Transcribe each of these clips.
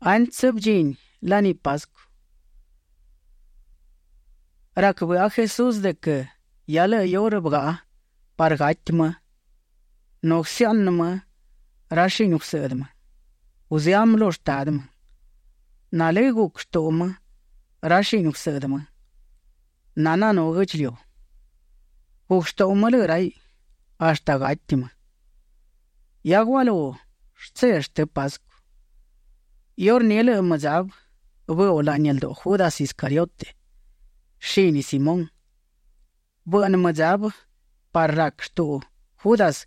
Antsë bëdchini laní Pascu, rac bëꞌa Jesús de quë hia lëꞌë iurë bëgaꞌa parë gati më nu guësëaꞌnë më ra shini gusëꞌdë më; guzëá më lu Shtadë më. Nalë́ guc shtuꞌu më ra shini gusëꞌdë më nananú guë́ꞌdchiliu. Guc shtuꞌu më lëꞌë raiꞌ hashtë gati më. Hia gualú shtse shtë Pascu, iurní lëꞌë mëdzabë bëuꞌ laꞌni lduꞌu Judas Iscariote, shini Simón. Bëꞌnë mëdzabë parë rac shtuꞌu Judas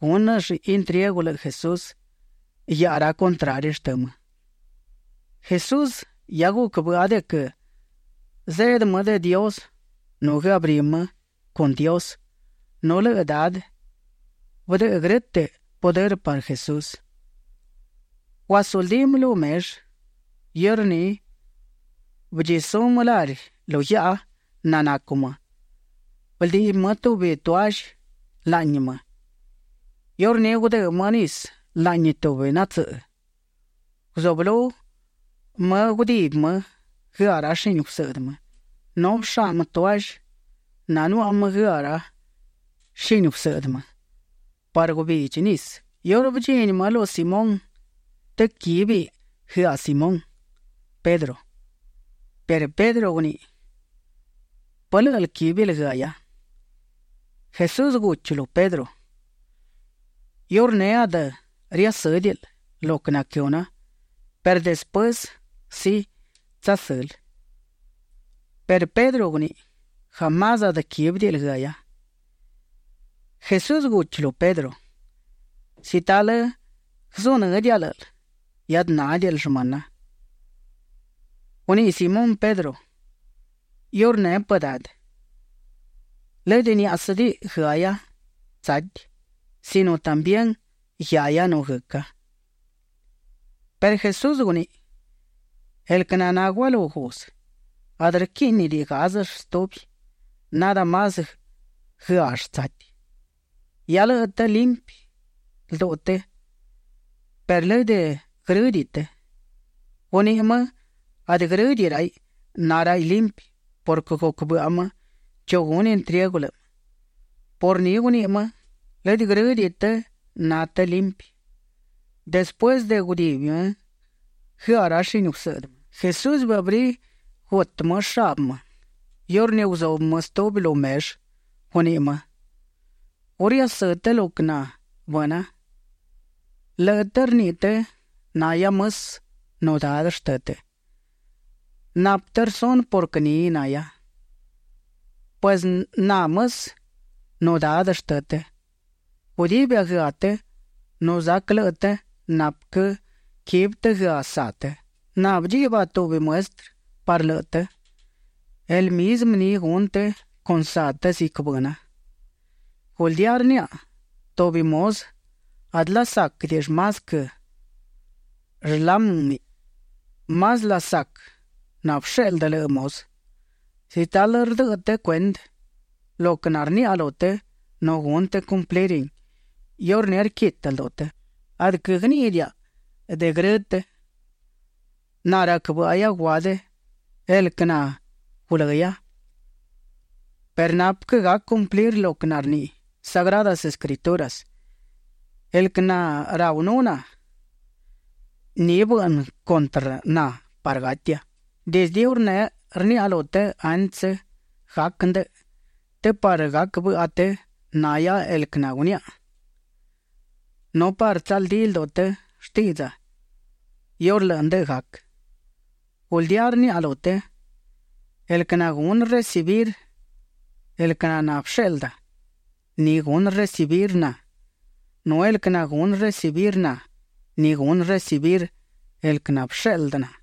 gúnëll intriegu lëꞌë Jesús guiaꞌa ra contrari shtë më. Jesús hia guc bëꞌa de quë zeꞌdë më de Dios nu guëabrí më con Dios nu lëꞌë Dadë bëdëꞌë grë́tëꞌ pudërë parë Jesús. Guasuldí më lu mellë. Iurní bëdchisú më lari lu guiaꞌa nanacu më. Bëldiꞌbi më tubi toallë laꞌni më. Iurní gudë́ më nisë laꞌni tubi natsëꞌë. Guzublú më gudibi më guëaꞌ ra shini gusëꞌdë më nu bëshá më toallë nanuaꞌa më guëaꞌ shini gusëꞌdë më parë guëbidchi nisë. Iurë bëdchini më lu Simón të quíbiꞌ guëaꞌ Simón Pedro, perë Pedro guniꞌi: ―¿Pë lë́ꞌël quíbil guëahia? Jesús guchi lu Pedro: ―Iurneꞌ adë riasë́diꞌil lo quë naquëhuna perë despuësë sí, tsasël. Perë Pedro guniꞌi: ―Jamás adë quíbidiꞌil guëahia. Jesús guchi lu Pedro: ―Si talë guëzunë́diaꞌa lë́ꞌël, hiadë nádiꞌil shmëna. Guniꞌi Simón Pedro: ―Iurneꞌ pë Dadë, lëdë niáꞌasëdiꞌi guëahia tsati sino también guiahia nu guëca. Perë Jesús guniꞌi: ―El quë naná gualú guzë, adë rquíꞌnidiꞌi gázëll stubi, nadë más guëaꞌll tsati. Hia lëꞌë të limpi lduꞌu të perë lëdë grë́diꞌi të. Guniꞌi më adë grë́diꞌi raiꞌ na raiꞌ limpi purquë guc bëꞌa më chu gunë intriegu lëꞌë më. Por ni guniꞌi më: “Lëdë grë́diꞌi të na të limpi”. Despuësë de gudibi më guëaꞌ ra shini gusëꞌdë më, Jesús bëabrí gutë më shabë më; iurní guzubë më stubi lu mellë. Guniꞌi më: ―¿Gu riasë́ të lo quë naná bëna? Lëꞌë të rniꞌi të nahia mësë nu Dadë shtë të. Napë të rsunë purquë ni nahia. Pues na, mësë nu Dadë shtë të, gudibia guëaꞌ të nu zac lëꞌë të napë quë quibi të guëaꞌ saꞌ të. Na bëdchiꞌba tubi muestrë parë lëꞌë të. El mizmë ni gunë të con saꞌ të ziquë nabëna. Guldía rniaꞌa, tubi muzë adë lasáquëdiꞌill más quë shlámiꞌ; más lasac nabësheꞌldë lëꞌë muzë. Si talë rdëꞌë të cuendë lo quë narniaꞌa lu të nu gunë të cumplirin, iurní rquitë lduꞌu të. ’Adë quëgníꞌidiaꞌa de grë të. Na rac bë́ꞌahia guadë el quë nagulëhia perë napë quë gac cumplir lo quë narniꞌi Sagradas Escrituras: “El quë naraunú na, ni bëꞌnë cuntrë na parë gatia”. Dizdë iurneꞌ rniaꞌa lu të antsë gac ndëꞌë të parë gac bëꞌa të nahia el quë naguniaꞌa nu parë tsaldí lduꞌu të shtiꞌdza iurë lëꞌë ndëꞌë gac. Guldía rniaꞌa lu të, el quë nagunë recibir el quë naná bësheꞌlda, ni gunë recibir na, nu el quë nagunë recibir na, ni gunë recibir el quë nabësheꞌldë na.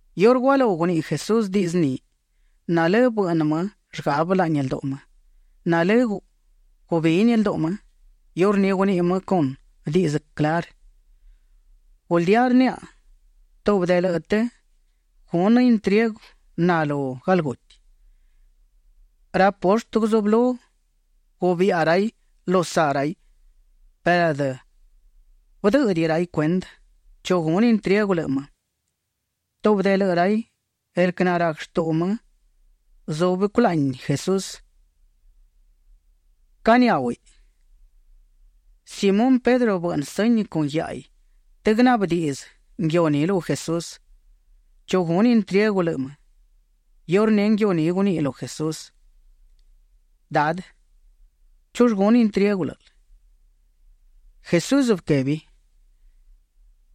Iurë gualú guniꞌi Jesús diꞌdzë ni, nalë́ bëꞌnë më llgabe laꞌni lduꞌu më; nalë́ gubini lduꞌu më. Iurní guniꞌi më con diꞌdzë clarë: ―Guldía rniaꞌa, tubi de lëꞌë të gunë intriegu na lu galguti. Ra poshtë guzublú gubiꞌa raiꞌ lu saꞌ raiꞌ perë adë bëdë́ꞌëdiꞌi raiꞌ cuendë chu gunë intriegu lëꞌë më. Tubi de lëꞌë raiꞌ, el quë narac shtuꞌu më, zúbiꞌ culaꞌni Jesús; caniháuhiꞌ. Simón Pedro bëꞌnë sëñi con guiáꞌaiꞌ të guënaꞌbë diꞌdzë nguiu ni lu Jesús, chu gunë intriegu lëꞌë më. Iurní nguiu ni guniꞌi lu Jesús: ―Dadë, ¿chull gunë intriegu lë́ꞌël? Jesús bëquebi: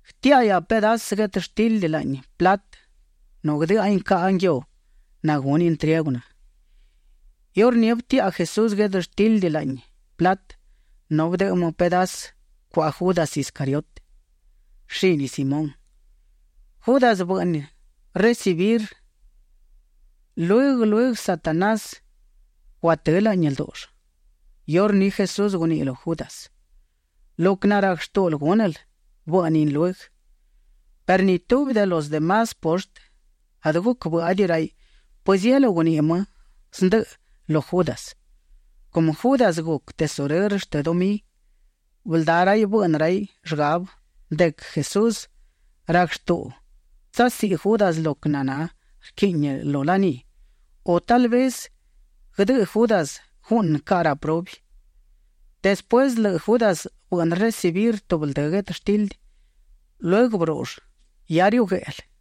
―Guëtiáꞌahia pedasë guetështildi laꞌni platë nu guëdë́ꞌahin caꞌa nguiu nagunë intriegu na. Iurní bëtiaꞌa Jesús guetështildi laꞌni platë nu bëdëꞌë më pedasë cuaꞌa Judas Iscariote, shini Simón. Judas bëꞌnë recibirin; lueguë lueguë Satanás guatë́ laꞌni ldúꞌull. Iurní Jesús guniꞌi lu Judas: ―Lo quë narac shtúꞌul gúnël, bëꞌnin lueguë. Perë ni tubi de los de más poshtë adë guc bë́ꞌadiꞌi raiꞌ pëzielú guniꞌi më zndëꞌë lu Judas. Cumë Judas guc tesurërë shtë dumí, bëldá raiꞌ bëꞌnë raiꞌ llgabë de quë Jesús rac shtuꞌu tsasiꞌi Judas lo quë naná rquiꞌni lu laní, u tal vez guëdëꞌë Judas guꞌnë caꞌa ra prubi. Despuësë de lëꞌë Judas bëꞌnë recibir tubi ldë guetështildi, lueguë bërúꞌull. Hia riuꞌ gueꞌlë.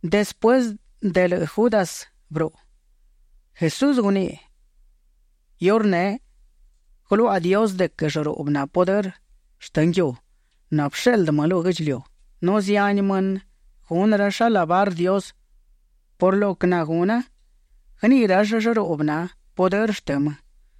Despuësë de lëꞌë Judas bëruꞌu, Jesús guniꞌi: ―Iurneꞌ guëluaꞌa Dios de quë llëruꞌbë na pudërë shtë nguiu nabësheꞌldë më lu guë́ꞌdchiliu, nu zihani mënë gunë rall alabar Dios por lo quë naguna; guëniꞌi rall llëruꞌbë na pudërë shtë më.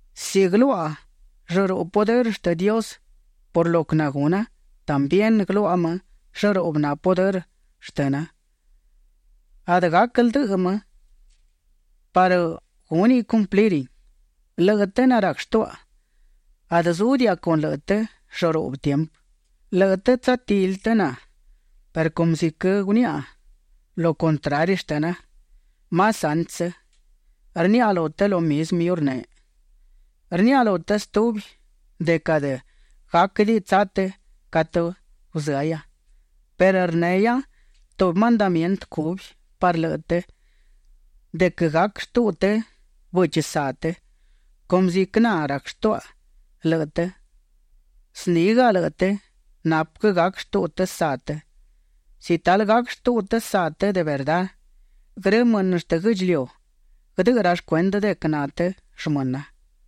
Si guëluaꞌa llëruꞌbë pudërë shtë Dios por lo quë naguna, también guëluaꞌa më llëruꞌbë na pudërë shtëna. Adë gac ldëꞌë më parë gúniꞌ cumplirin. Lëꞌë të narac shtuaꞌa, adë zúdiaꞌa con lëꞌë të llëruꞌbë tiempë. Lëꞌë të tsatili të na perë cumë ziquë guniaꞌa lu contrari shtëna más antsë, rniaꞌa lu të lo mizmë iurneꞌ. Rniaꞌa lu të stubi de quë adë gáquëdiꞌi tsa të catë guzëahia. Perë rnehia tubi mandamientë cubi parë lëꞌë të de quë gac shtuꞌu të bëchi saꞌ të. Cumë ziquë na rac shtuaꞌa lëꞌë të, znígaꞌa lëꞌë të napë quë gac shtuꞌu të saꞌ të. Si talë gac shtuꞌu të saꞌ të de verdá, grë mënë shtë guë́ꞌdchiliu guëdëꞌë rall cuendë de quë na të shmëna.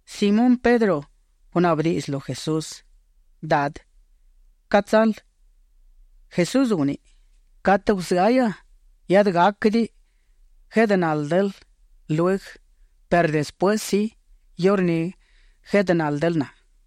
Simón Pedro gunaꞌbë diꞌdzë lu Jesús: ―Dadë, ¿ca tsal? Jesús guniꞌi: ―Catë guzëahia, hiadë gáquëdiꞌi gueꞌdë náldël lueguë perë despuësë, sí, iurní gueꞌdë náldël na.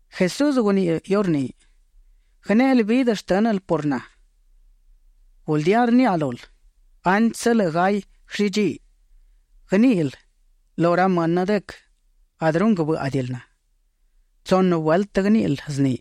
Jesús guniꞌi iurní: ―¿Guënéꞌel vidë shtë́nël por na? Guldía rniaꞌa lul, antsë lëꞌë gay guëllidchí, guëníꞌil lu ra mënë de quë adë runguë bë́ꞌadiꞌil na. Tsunë vueltë guëníꞌil zni.